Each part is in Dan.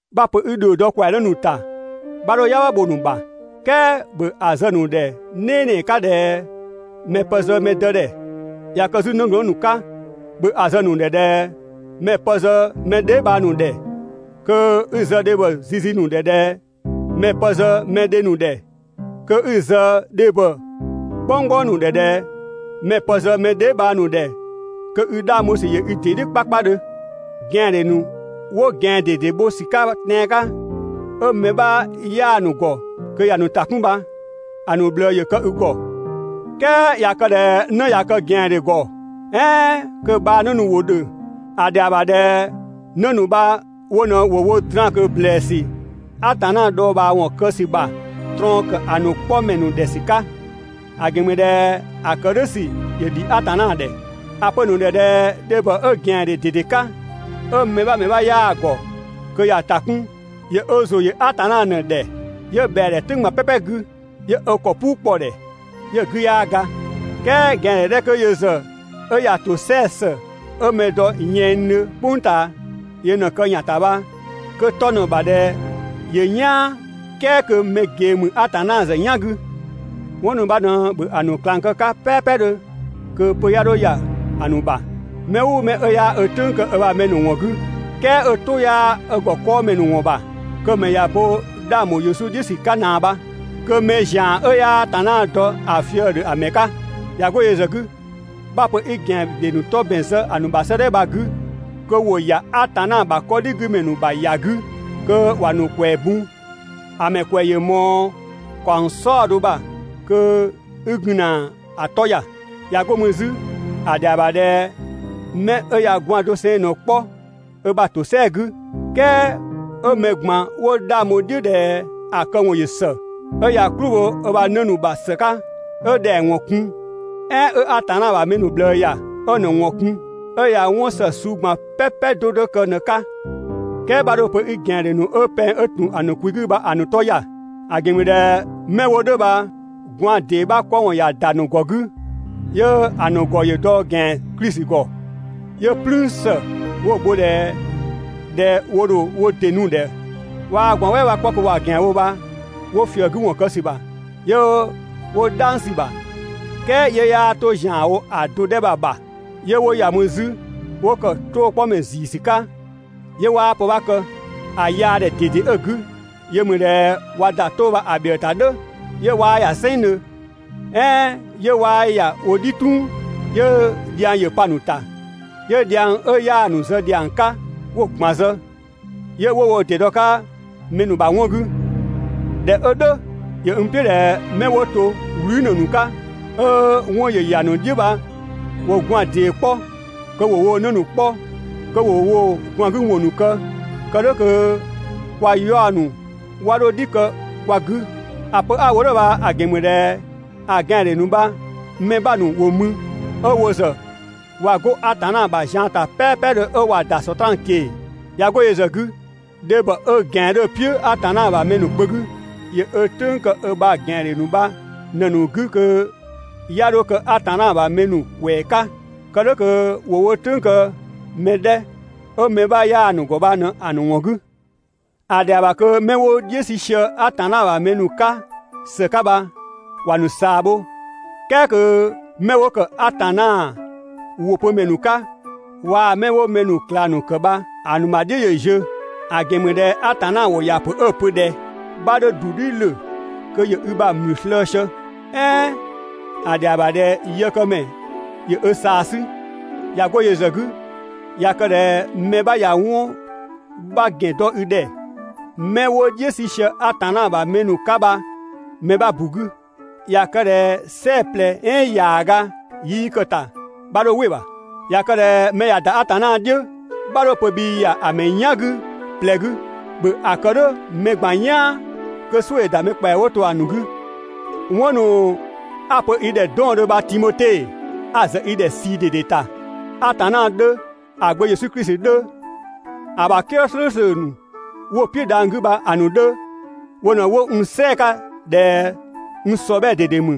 'Bha‑ pö 'i ‑dhio dɔ ‑kwɛanë ‑nu ‑ta, 'bha 'dho "yangbha bho‑ ‑nu ‑bha, "kɛɛ ‑bhö ‑a zë‑ ‑nu ‑dhɛ "nɛɛnɛɛ 'ka ꞊dhɛ mɛ‑ pë zë mɛ dë ‑dhɛ. ꞊Ya kë 'zü 'nëglɔɔn ‑nu 'ka, ‑bhö ‑a zë‑ ‑nu ‑dhɛ ꞊dhɛ mɛ‑ pë zë mɛ dheebhang ‑nu ‑dhɛ. Kö 'i‑ zë dhebhɔ zizi ‑nu ‑dhɛ ꞊dhɛ mɛ‑ pë zë mɛ dhe ‑nu ‑dhɛ, kö 'i‑ zë dhebhɔ "gbɔnggbɔng ‑nu ‑dhɛ ꞊dhɛ mɛ‑ pë zë mɛ dheebhang ‑nu ‑dhɛ kö i 'dhang bho ‑sü ‑yö i ‑dɩ "dhiʋ̈ 'kpakpadhö. ꞊Gɛandhe ‑nu 'wo ꞊gɛan ꞊dede bho ‑sü 'ka tɛan‑ 'ka, ('ö mɛ 'bha 'yaa‑ ‑nu ‑gɔ kö ‑ya ‑nu ‑ta 'kun bha) ‑a ‑nu ꞊bhlëë ‑yö kë i ‑gɔ. "Kɛɛ ꞊ya kë ꞊dhɛ 'në ꞊ya kë ꞊gɛandhe ‑gɔ, "ɛɛn kö‑ bhaanë ‑nu ‑wo ‑dhö, ‑a ‑dhɛa ‑bha ꞊dhɛ 'në ‑nu bha wo ꞊në ‑wo wo draan‑ ꞊kö ‑blɛɛsü Atanna dhɔɔbhaawɔn kë ‑sü ‑bha ꞊trɔɔn ‑kë ‑a ‑nu 'kpɔmɛ ‑nu ‑dhɛ ‑sü 'ka, ‑a ‑gɛn ‑mü ꞊dhɛ ‑a ‑kë "dhʋ̈ ‑sü ‑yö ‑dhi Atanna ‑dhɛ. ‑A pö‑ ‑nu ‑dhɛ ꞊dhɛ dhebhɔ 'ö ꞊gɛandhe ꞊dede 'ka, 'ö mɛ 'bha ‑mɛ 'bha 'yaa‑ ‑gɔ kö ‑ya ‑ta 'kun ‑yö ö ‑zʋ ‑yö Atanna ꞊në‑ ‑dhɛ, 'yö ꞊bhɛa‑ ‑dhɛ "tʋ̈ng ꞊gban "pɛpɛ 'gü, 'yö ö ‑kɔ "puu kpɔ‑ ‑dhɛ, 'yö‑ 'gü 'yaa ga. "Kɛɛ ꞊gɛandhe 'dhɛ 'kö yö ‑zë 'ö ‑ya ‑tosɛa ‑së 'ö mɛ dɔ yɛnngdhö "kpʋng ꞊taa yö ꞊në‑ kë ‑yan ‑ta bha, kö‑ 'tɔ ꞊në‑ ‑bha ꞊dhɛ ‑yö "yaan "kɛɛ kö mɛ ꞊gee ‑mü Atanna ‑zë "yan 'gü. 'Wɔn ‑nu bha ꞊në ‑bhö ‑a ‑nu ꞊klang kë‑ 'ka "pɛɛpɛdhö kö pö 'ya 'dho ‑ya ‑a ‑nu ‑bha. Mɛ "ʋʋ mɛ 'ö 'yaa ö "tʋ̈ng kë ö ‑bha mɛ ‑nu ‑wɔn 'gü, "kɛɛ 'ö‑ "tʋ 'yaa ö ‑gɔ 'kɔɔmɛ ‑nu ‑wɔn ‑bha, kö‑ ‑mɛ ꞊ya ö bo 'dhang ‑bho Yesu "dhiʋ̈ ‑sü 'ka ꞊naa bha, kö mɛ ‑zian 'ö 'yaa Atanna dɔ ‑a fië‑ ‑dhö ‑a ‑mɛ 'ka. ꞊Ya 'go yö ‑zë 'gü, 'bha‑ pö 'i ꞊gɛandhe ‑nu 'tɔ ‑bɛn zë ‑a ‑nu ‑bha 'sëëdhɛ bha‑ 'gü, (kö ‑wo ‑ya Atanna ‑bha 'kɔdhigümɛ ‑nu ‑bha ‑ya 'gü kö ‑wa ‑nu ‑kwɛɛ bun), ‑a ‑mɛ ‑kwɛ ‑yö ꞊mɔɔ ‑kaɔng "saɔdo ‑bha kö 'i gun ‑na ‑a 'tɔ ‑ya. ꞊Ya 'go mü 'zü ‑a ‑dhɛa ‑bha ꞊dhɛ ‑a ‑mɛ ‑yö kë 'mɛ 'ö ꞊ya gwaan‑ doseng ꞊në‑ 'kpɔ ö ‑bha ‑tosɛa 'gü, "kɛɛ 'ö mɛ ꞊gban 'wo 'dhang bho‑ "dhiʋ̈ ꞊dhɛ ‑a këwɔn ‑yö ‑së, 'ö ꞊ya "klʋ bho ö ‑bha 'në ‑nu ‑bha ‑së 'ka, 'ö ‑dhɛng ‑wɔn kun, "ɛɛn 'ö Atanna ‑bha mɛ ‑nu ꞊bhlëë ‑ya, 'ö‑ ‑nu ‑wɔn kun, 'ö ꞊ya ‑wëëmɛ ‑nu ‑ta 'kun, 'ö ꞊ya 'wɔn ‑së suu ꞊gban "pɛpɛ 'do 'do kë ꞊në‑ 'ka. "Kɛɛ 'bha 'dho‑ pö 'i ꞊gɛandhe ‑nu 'ö pɛng 'dhö ‑tun ‑a ‑nu kwi 'gü bha‑ ‑nu 'tɔ ‑ya. ‑A ‑gɛn ‑mü ꞊dhɛ 'mɛ 'wo "dhʋ̈ bha gwaan‑ ‑dee 'bha 'kpɔ ‑wɔn ꞊ya ‑da ‑nu ‑gɔ 'gü, 'yö‑ ‑nu ‑gɔ ‑yö dɔ ‑gɛan Klisi ‑gɔ. 'Yö "plüün ‑së 'wo‑ bho‑ ‑dhɛ (꞊dhɛ wo ‑dho wo ‑dɩ nu‑ ‑dhɛ 'ö 'waa gwaan‑ "wɛɛ 'bha 'kpɔ kö ꞊wa ꞊gɛan bho) bha 'wo ꞊fië‑ 'gü ‑wɔn kë ‑sü ‑bha 'yö 'wo "dhang sü‑ ‑bha. "Kɛɛ 'yö 'yaa 'to ‑zianwo ‑a do 'dhɛ bha‑ ‑bha, 'yö 'wo ‑ya mü 'zü 'wo ‑kë "tʋʋ‑ 'kpɔ ‑mɛ ‑ziisü 'ka 'yö 'waa pë 'bha kë, ‑a yaadhɛ ꞊dede 'ö‑ 'gü, yö ‑mü ꞊dhɛ ꞊wa ‑da "tʋʋ‑ bha‑ ‑bhiëë ‑ta "dhʋ̈, 'yö 'waa ‑ya "sɛnngdhö, "ɛɛn 'yö 'waa ‑ya wo "dhi "tʋng, 'yö dhiang ‑yö pa‑ ‑nu ‑ta, 'yö dhiang 'ö 'yaa‑ ‑nu zë ‑dhiang 'ka 'wo‑ ꞊gban zë, 'yö 'wo wo ‑dɩ dɔ‑ 'ka mɛ ‑nu ‑bha 'wɔn 'gü. ꞊Dhɛ 'ö "dhʋ̈, ‑yö n "piʋ̈ ꞊dhɛ 'mɛ 'wo to "wlü ‑mɛ ‑nu 'ka 'ö 'wɔn ‑yö ‑ya ‑nu "dhiʋ̈ bha ‑wo gwaan‑ ‑dee 'kpɔ kö ‑wo woo 'në ‑nu 'kpɔ, kö ‑wo woo gwaan‑ 'gü ‑wɔn ‑nu kë, kë "dhʋ̈ kö kwa 'yaɔ‑ ‑nu 'wa 'dho "dhi kë kwa 'gü. ‑A pö 'a‑ wo "dhʋ̈ bha‑ ‑gɛn ‑mü ꞊dhɛ ‑a ꞊gɛandhe ‑nu bha‑ mɛ 'bha ‑nu ‑wo mü 'ö wo ‑zë ꞊wa 'go Atanna ‑bha zian ‑ta "pɛɛpɛdhö 'ö ꞊wa ‑da Sɔtraan ꞊keng‑. ꞊Ya 'go yö ‑zë 'gü, dhebhɔ 'ö ꞊gɛan 'dhö‑ "piʋ̈ Atanna ‑bha mɛ ‑nu kpö 'gü, ‑yö ö "tʋ̈ng kë ö ‑bha ꞊gɛandhe ‑nu bha ꞊në‑ ‑nu 'gü kö 'ya 'dho kë Atanna ‑bha mɛ ‑nu ꞊kwɛɛ 'ka, kë "dhʋ̈ kö ‑wo wo "tʋ̈ng kë mɛ 'dhɛ 'ö mɛ 'bha 'yaa‑ ‑nu ‑gɔ ‑bha ꞊në‑ ‑nu ‑wɔn 'gü. ‑A ‑dhɛa ‑bha kö 'mɛ 'wo "dhiʋ̈ 'sü sië Atanna ‑bha mɛ ‑nu 'ka ‑së 'ka bha ‑wa ‑nu ꞊saa bho, "kɛɛ kö 'mɛ 'wo ‑kë Atanna ‑wʋ pö ‑mɛ ‑nu 'ka waa‑ 'mɛ 'wo mɛ ‑nu ꞊klang ‑nu ‑kë bha‑ ‑nu ‑bha "dhiʋ̈ ‑yö ziö. ‑A ‑gɛn ‑mü ꞊dhɛ Atanna ‑wʋ ‑ya ‑pö 'ö‑ pö ꞊dhɛ: «'Bha 'dho ‑du "dhi ‑lö kö ‑yö i ‑bha ‑mlü slëë‑ sië» "ɛɛn: «‑A ‑dhɛa ‑bha ꞊dhɛ yëkëmɛ ‑yö ö ꞊saa 'sü.» ꞊Ya 'go yö ‑zë 'gü, ꞊ya kë ꞊dhɛ mɛ 'bha ꞊ya 'wɔn 'bha ‑gɛn dɔ i ‑dhɛ 'mɛ 'wo "dhiʋ̈ 'sü sië Atanna ‑bha mɛ ‑nu 'ka bha‑ mɛ 'bha ‑bu 'gü, ꞊ya kë ꞊dhɛ "sɛɛ‑ ꞊plɛ "ɛɛn ‑yaaga 'yii kë‑ ‑ta, 'bha 'dho "wɩ‑ ‑bha. ꞊Ya kë ꞊dhɛ mɛ ꞊ya ‑da Atanna "dhiʋ̈, 'bha 'dho‑ pö bhii ‑ya ‑a ‑mɛ "yan 'gü ꞊plɛ 'gü, ‑bhö ‑a kë "dhʋ̈ mɛ ꞊gban "yaan kö "suʋ̈‑ ‑nu ‑da mɛ ‑kpɛa 'wo to ‑a ‑nu 'gü. 'Wɔn ‑nu 'a‑ pö i ‑dhɛ 'dɔɔndhö bha Timote, 'a‑ zë i ‑dhɛ ꞊sii ꞊dede ‑ta, Atanna 'dhö, ‑a Gbö Yesu Klisi 'dhö, ‑a ‑bha "kië "slʋ̈ʋ̈slʋ̈ ‑nu 'wo‑ "piʋ̈ dhang‑ 'gü bha‑ ‑nu 'dhö, wo ꞊në 'wo n "sɛɛ‑ 'ka ꞊dhɛ n ‑sɔbhɛɛ ꞊dede ‑mü,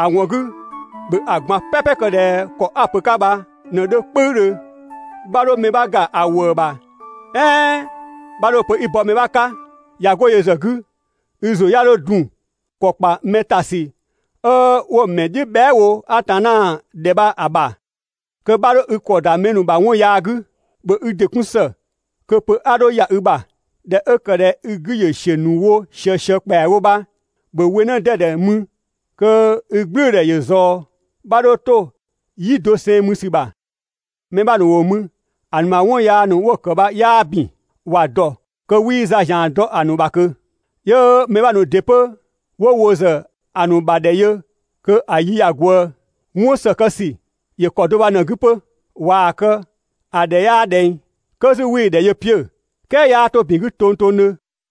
‑a ‑wɔn 'gü ‑bhö ‑a ꞊gban "pɛpɛ kë ꞊dhɛ ‑kɔ 'a‑ pö‑ 'ka bha ꞊në‑ 'dhö "kpʋ̈üdhö. 'Bha 'dho mɛ 'bha ‑ga ‑a ‑wëë ‑bha "ɛɛn 'bha 'dho‑ pö 'i bɔ mɛ 'ka. ꞊Ya 'go yö ‑zë 'gü, i ‑zʋ 'ya 'dho dun ‑kɔ ‑kpa mɛ ‑ta ‑sü 'ö 'wo‑ ‑mɛ "dhiʋ̈ bhɛa" wo Atanna ‑dhɛ bha‑ ‑bha, kö 'bha 'dho i ‑kɔ ‑da mɛ ‑nu ‑bha 'wɔn yaa 'gü. ‑Bhö i ‑dɩ 'kun ‑së kö pö 'a 'dho ‑ya i ‑bha. ꞊Dhɛ 'ö ‑kë ꞊dhɛ i 'gü ‑yö ‑siö ‑nu wo ꞊siësië ‑kpɛawo bha, ‑bhö we 'në 'dɛdɛ mü kö i "gblʋ̈ʋ̈dhɛ ‑yö ꞊zɔɔ, 'bha 'dho 'to "yi doseng mü ‑sü ‑bha. Mɛ 'bha ‑nu 'wo mü ‑a ‑nu ‑bha 'wɔn yaa ‑nu 'wo‑ ‑kë bha 'yaa ‑bin. ‑Wa ‑dɔ kö 'wii za ‑zian dɔ‑ ‑nu ‑bha ꞊kö. 'Yö mɛ 'bha ‑nu ‑dɩ 'pö 'wo wo ‑zë ‑a ‑nu ‑bha ‑dhɛ yö kö‑ yi ꞊në ꞊ya ꞊gwëë. 'Wɔn ‑së kë ‑sü ‑yö ‑kɔ do bha ꞊në‑ 'gü 'pö. ꞊Waa‑ kë, ‑a ‑dhɛ 'yaa ꞊dhɛng. 'Kö 'zü 'wii‑ ‑dhɛ yö 'piö‑, "kɛɛ 'yaa 'to ‑bin 'gü tongtongdhö.